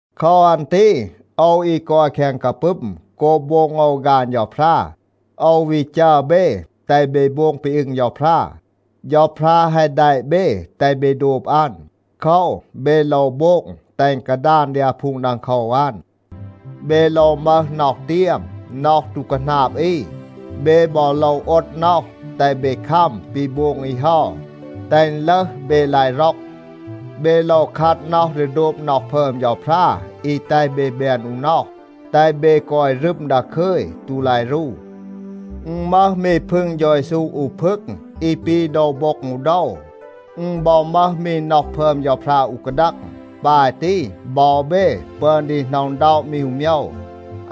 โคว อัน ตี โอว อี กอย แคง กาปึม โกบ โบง โอว ฆาน เฌาพรา, โอว วี จัร เบ, แตห เบ โบง ปี อึง เฌาพรา. เฌาพรา แฮะ แดะ เบ แตห เบ โดบ อัน. โคว, เบ โลว โบง แตห อึณ กาดาน ดี อาพูง ดังโคว อัน. เบ โลว มึห น็อห เตียม, น็อห ตู คาหนาบ อี. เบ บอ โลว โอด น็อห, แตห เบ คัม ปี โบง อี เฮา, แตห อึณ ลึห, เบ ลาย ร็อก. เบ โลว คัด น็อห ดี โดบ น็อห พึอม เฌาพรา อี แตห เบ แบน อู น็อห, แตห เบ กอย รึม ดาคึย, ตู ลาย รู. อึณ มึห มี พึง เฌา เยซู อู พึง, อี ปี โดว โบ็ง อู โดว. อึณ บอ มึห มี น็อห พึอม เฌาพรา อู กาดัง. ปาย ตี บอ เบ ปึอน ดี หน็อะ อึณด็อะ มี อู โมยว.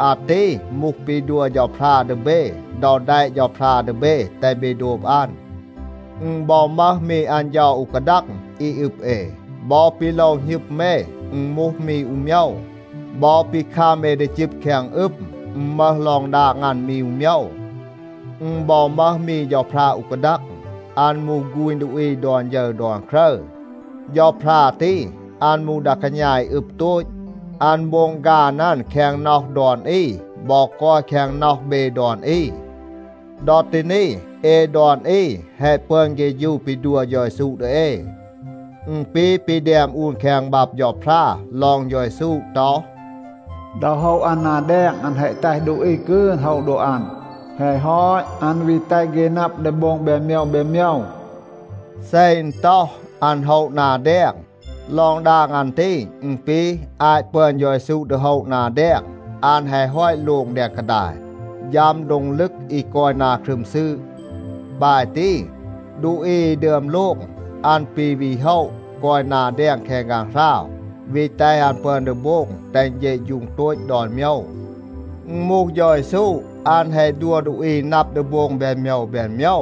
อาตี มูห ปี ดัว เฌาพรา ดี เบ ดอ แดะ เฌาพรา ดี เบ, แตห เบ โดบ อัน. อึณ บอ มึห มี อัน เฌา อู กาดัง อี อึบ เอ. บอ ปี โลว หณึม เอ อึณ มูห มี อู โมยว. บอ ปี คัม เอ ดี จึบ แคง อึม, อึณ มึห ลอง ดาง อัน มี อู โมยว. อึณ บอ มึห มี เฌาพรา อู กาดัง. อัน มูห ฆูณ ดูอี ดอน ฌึร ดอน ครึร. เฌาพรา ตี, อัน มูห ดา กาณา อี อึบ โตต. อัน โบง ฆาน อัน แคง น็อห ดอน อี บอ กอย แคง น็อห เบ ดอน อี. ดอ ตี นี, เอ ดอน อี แฮะ ปึอน เฆฌู ปี ดัว เฌา เยซู ดี เอ. อึณ ปี ปี แดม อูน แคง บับ เฌาพรา ลอง เฌา เยซู ต็อห, “ดอ โฮะ อัน นา แดง, อัน แฮะ แตห ดูอี กืน โฮะ โดบ อัน. แฮะ ฮอต, อัน วี แตห เฆ นับ ดี โบง แบน โมยว แบน โมยว.” เซ อึณ ต็อห, “อัน โฮะ นา แดง,” ลอง ดาง อัน ตี อึณ ปี, อาต ปึอน เฌา เยซู ดี โฮะ นา แดง, อัน แฮะ ฮอต โลง แดง กาดาย, ฌัม โดง ลึก อี กอย นา ครึม ซืด. ปาย ตี, ดูอี อี ดึอม โลง, อัน ปี วี โฮะ กอย นา แดง แคง ฆางหราว, วี แตห อัน ปึอน ดี โบง แตห อึณ เฌะฌูง โตต ดอน โมยว. อึณ มูห เฌา เยซู, อัน แฮะ ดัว ดูอี นับ ดี โบง แบน โมยว แบน โมยว.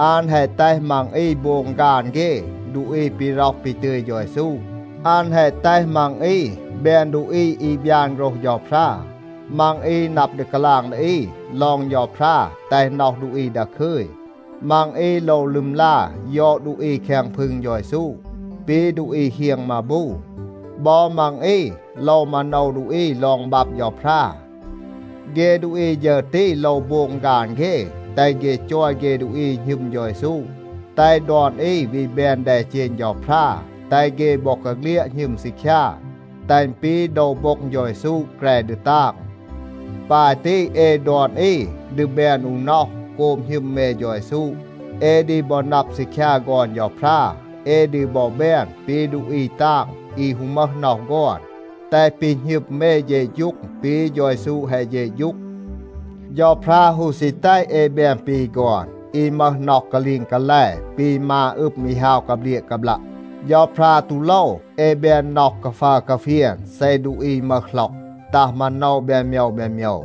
อัน แฮะ แตห มัง อี โบง ฆาน เฆ ดูอี ปี ร็อห ปี ตึย เฌา เยซู. อัน แฮะ แตห มัง อี แบน ดูอี อี บยาน โฆรห เฌาพรา, มัง อี นับ ดี กาลาง ดี อี ลอง เฌาพรา แตห น็อห ดูอี ดาคึย. มัง อี โลว ลึมลา ยอด ดูอี แคง พึง เฌา เยซู, ปี ดูอี เฮียง มาบู. บอ มัง อี โลว มาโนว ดูอี ลอง บับ เฌาพรา. เฆ ดูอี ฌึร ตี โลว โบง ฆาน เฆ, แตห เฆ จอย เฆ ดูอี อี หณึม เฌา เยซู, แตห ดอน อี วี แบน แดเจณ เฌาพรา, แตห เฆ บอกาเฆลียด หณึม ซีคยา, แตห อึณ ปี โดว โบ็ง เฌา เยซู แกร ดี ตาง. ปาย ตี เอ ดอน อี ดี แบน อู น็อห โกบ หณึม เอ เฌา เยซู. เอ ดี บอ นับ ซีคยา ฆอน เฌาพรา. เอ ดี บอ แบน ปี ดูอี ตาง อี ฮู มึห น็อห ฆอน, แตห ปี หณึม เอ เฌะฌูง ปี เฌา เยซู แฮะ เฌะฌูง. เฌาพรา ฮู ซี แตห เอ แบน ปี ฆอน, อี มึห น็อห กาลีง กาแล ปี มา อึม อี ฮาว กาเบลียะ กาบลัะ. เฌาพรา ตู โลว เอ แบน น็อห กาฟัร กาเฟียน เซ ดูอี มึห หล็อก, ตัห มาโนว แบน โมยว แบน โมยว.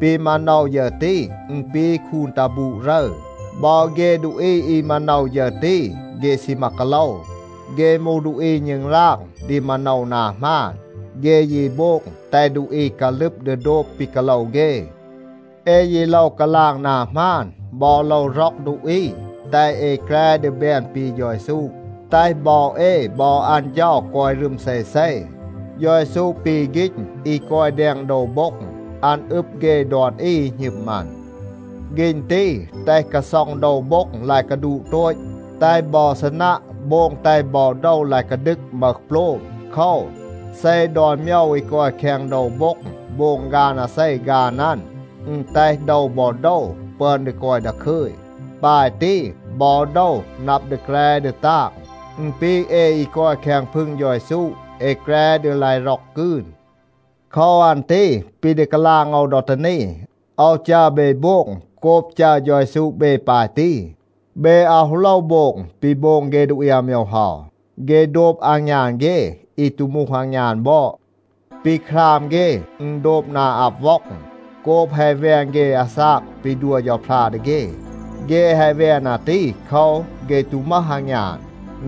ปี มาโนว ฌึร ตี อึณ ปี คูน ตัห บูด รึร. บอ เฆ ดูอี อี มาโนว ฌึร ตี, เฆ ซีมา กาโลว. เฆ มูห ดูอี ณึงราง ดี มาโนว นา หมาน. เฆ ยี โบง แตห ดูอี กาลึบ ดี โดบ ปี กาโลว เฆ. เอ ยี โลว กาลาง นา หมาน บอ โลว ร็อก ดูอี, แตห เอ แกร ดี แบน ปี เฌา เยซู, แตห บอ เอ บอ อัน เฌา กอย รึม เซเซ. เฌา เยซู ปี ฆีณ อี กอย แดง โดว โบ็ง. อัน อึบ เฆ ดอน อี อี หณึม อัน. ฆีณ ตี แตห กาซ็อง โดว โบ็ง ลาย กาดูต โตต, แตห บอ ซีนัะ โบง แตห บอ โดว ลาย กาดึก, มึห โปลม. โคว, เซ ดอน โมยว อี กอย แคง โดว โบ็ง โบง ฆาน อาเซ ฆาน อัน, อึณ แตห โดว บอ โดว ปึอน ดี กอย ดาคึย. ปาย ตี, บอ โดว นับ ดี แกร ดี ตาง. อึณ ปี เอ อี กอย แคง พึง เฌา เยซู, เอ แกร ดี ลาย ร็อก กืน. โคว อัน ตี ปี ดี กาลาง โอว ดอ ตี นี, โอว จัร เบ โบง โกบ จัร เฌา เยซู เบ ปาย ตี. เบ อาว ฮู โลว โบง ปี โบง เฆ ดูอี อาโมยว เฮา. เฆ โดบ อางยาน เฆ, อี ตู มูห อางยาน บอด. ปี คราม เฆ อึณ โดบ นา อับ ว็อง, โกบ แฮะ แวน เฆ อาซาก ปี ดัว เฌาพรา ดี เฆ. เฆ แฮะ แวน อาตี โคว, เฆ ตู มึห อางยาน.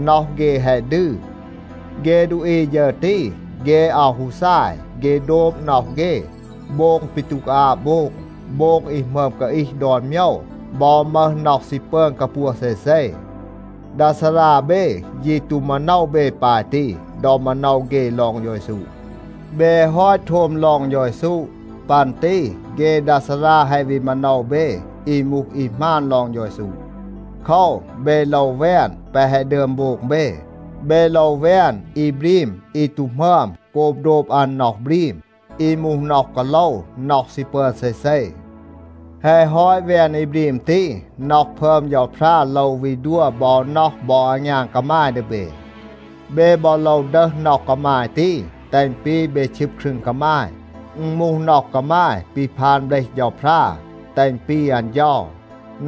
น็อห เฆ แฮะ ดืร. เฆ ดูอี ฌึร ตี, เฆ อาว ฮู ซาย. เฆ โดบ น็อห เฆ, โบง ปี ตู กาอาบ โบง, โบง อี หมึอม กาอีห ดอน โมยว บอ มึห น็อห ซี ปึอน กาปัว เซเซ. ดา ซารา เบ ยี ตู มาโนว เบ ปาย ตี ดอ มาโนว เฆ ลอง เฌา เยซู. เบ แฮะ ฮอต โทม ลอง เฌา เยซู. ปัน ตี เฆ ดา ซารา แฮะ วี มาโนว เบ อี มูห อี หมาน ลอง เฌา เยซู. โคว, เบ โลว แวน แปะ แฮะ ดึอม โบง เบ. เบ โลว แวน อี บรีม อี ตู หมึอม โกบ โดบ อัน น็อห บรีม, อี มูห น็อห กาโลว, น็อห ซี ปึอน เซเซ. แฮะ ฮอต แวน อี บรีม ตี, น็อห พึอม เฌาพรา โลว วี ดัว บอ น็อห บอ อางยาน กามาย ดี เบ. เบ บอ โลว ดึห น็อห กามาย ตี, แตห อึณ ปี เบ ชึบ ครึง กามาย. อึณ มูห น็อห กามาย ปี พาน เบลห เฌาพรา, แตห อึณ ปี อัน เฌา.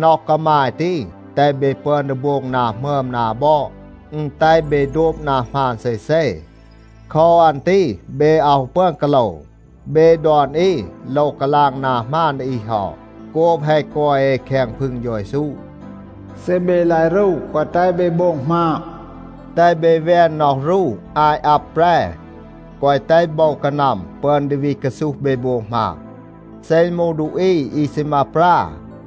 น็อห กามาย ตี แตห เบ ปึอน ดี โบง นา หมึอม นา บอด. อึณ แตห เบ โดบ นา หมาน เซเซ. โคว อัน ตี เบ อาว ฮู ปึอน กาโลว. เบ ดอน อี โลว กาลาง นา หมาน ดี อี เฮา, โกบ แฮะ กอย เอ แคง พึง เฌา เยซู. เซ เบ ลาย รู, แกวะ แตห เบ โบง หมาบ. แตห เบ แวน น็อห รู อาต อับ แปร. แกวะ แตห โบว กานัม ปึอน ดี วี กาซูห เบ โบง หมาบ. เซ อึณ มูห ดูอี อี ซีมา ปรา,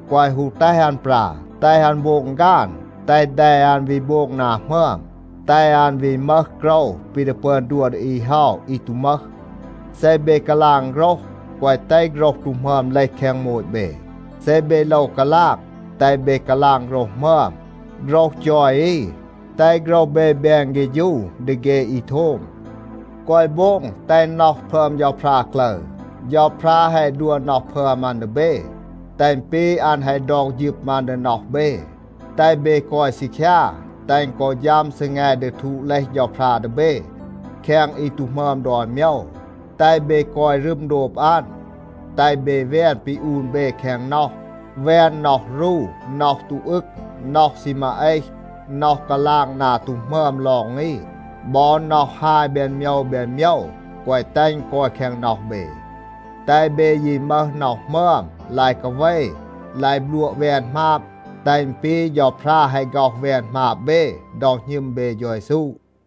แกวะ ฮู แตห อัน ปรา. แตห อัน โบง ฆาน, แตห แด อัน วี โบง นา หมึอม, แตห อัน วี มึห โกรว ปี ดี ปึอน ดัว ดี อี เฮา อี ตู มึห. เซ เบ กาลาง โฆรห, แกวะ แตห โฆรห ตู หมึอม เลห แคง โมต เบ. เซ เบ โลว กาลาง, แตห เบ กาลาง โฆรห หมึอม, โฆรห จอย อี, แตห โฆรห เบ แบน เฆฌู ดี เฆ อี โทม. แกวะ โบง แตห น็อห พึอม เฌาพรา กลึร. เฌาพรา แฮะ ดัว น็อห พึอม อัน ดี เบ, แตห อึณ ปี อัน แฮะ ดอก ฌึม อัน ดี น็อห เบ, แตห เบ กอย ซีคยา, แตห อึณ กอ ฌัม ซีแง ดี ทูด เลห เฌาพรา ดี เบ แคง อี ตู หมึอม ดอน โมยว, แตห เบ กอย รึม โดบ อัน. แตห เบ แวน ปี อูน เบ แคง น็อห. แวน น็อห รู, น็อห ตู อึง, น็อห ซีมา เอห, น็อห กาลาง นา ตู หมึอม ลอง อี, บอ น็อห ฮาย แบน โมยว แบน โมยว, แกวะ แตห อึณ กอย แคง น็อห เบ. แตห เบ ยี มึห น็อห หมึอม, ลาย กาเว, ลาย บลัวะ แวน หมาบ, แตห อึณ ปี เฌาพรา แฮะ ฆ็อห แวน หมาบ เบ ดอ หณึม เบ เฌา เยซู.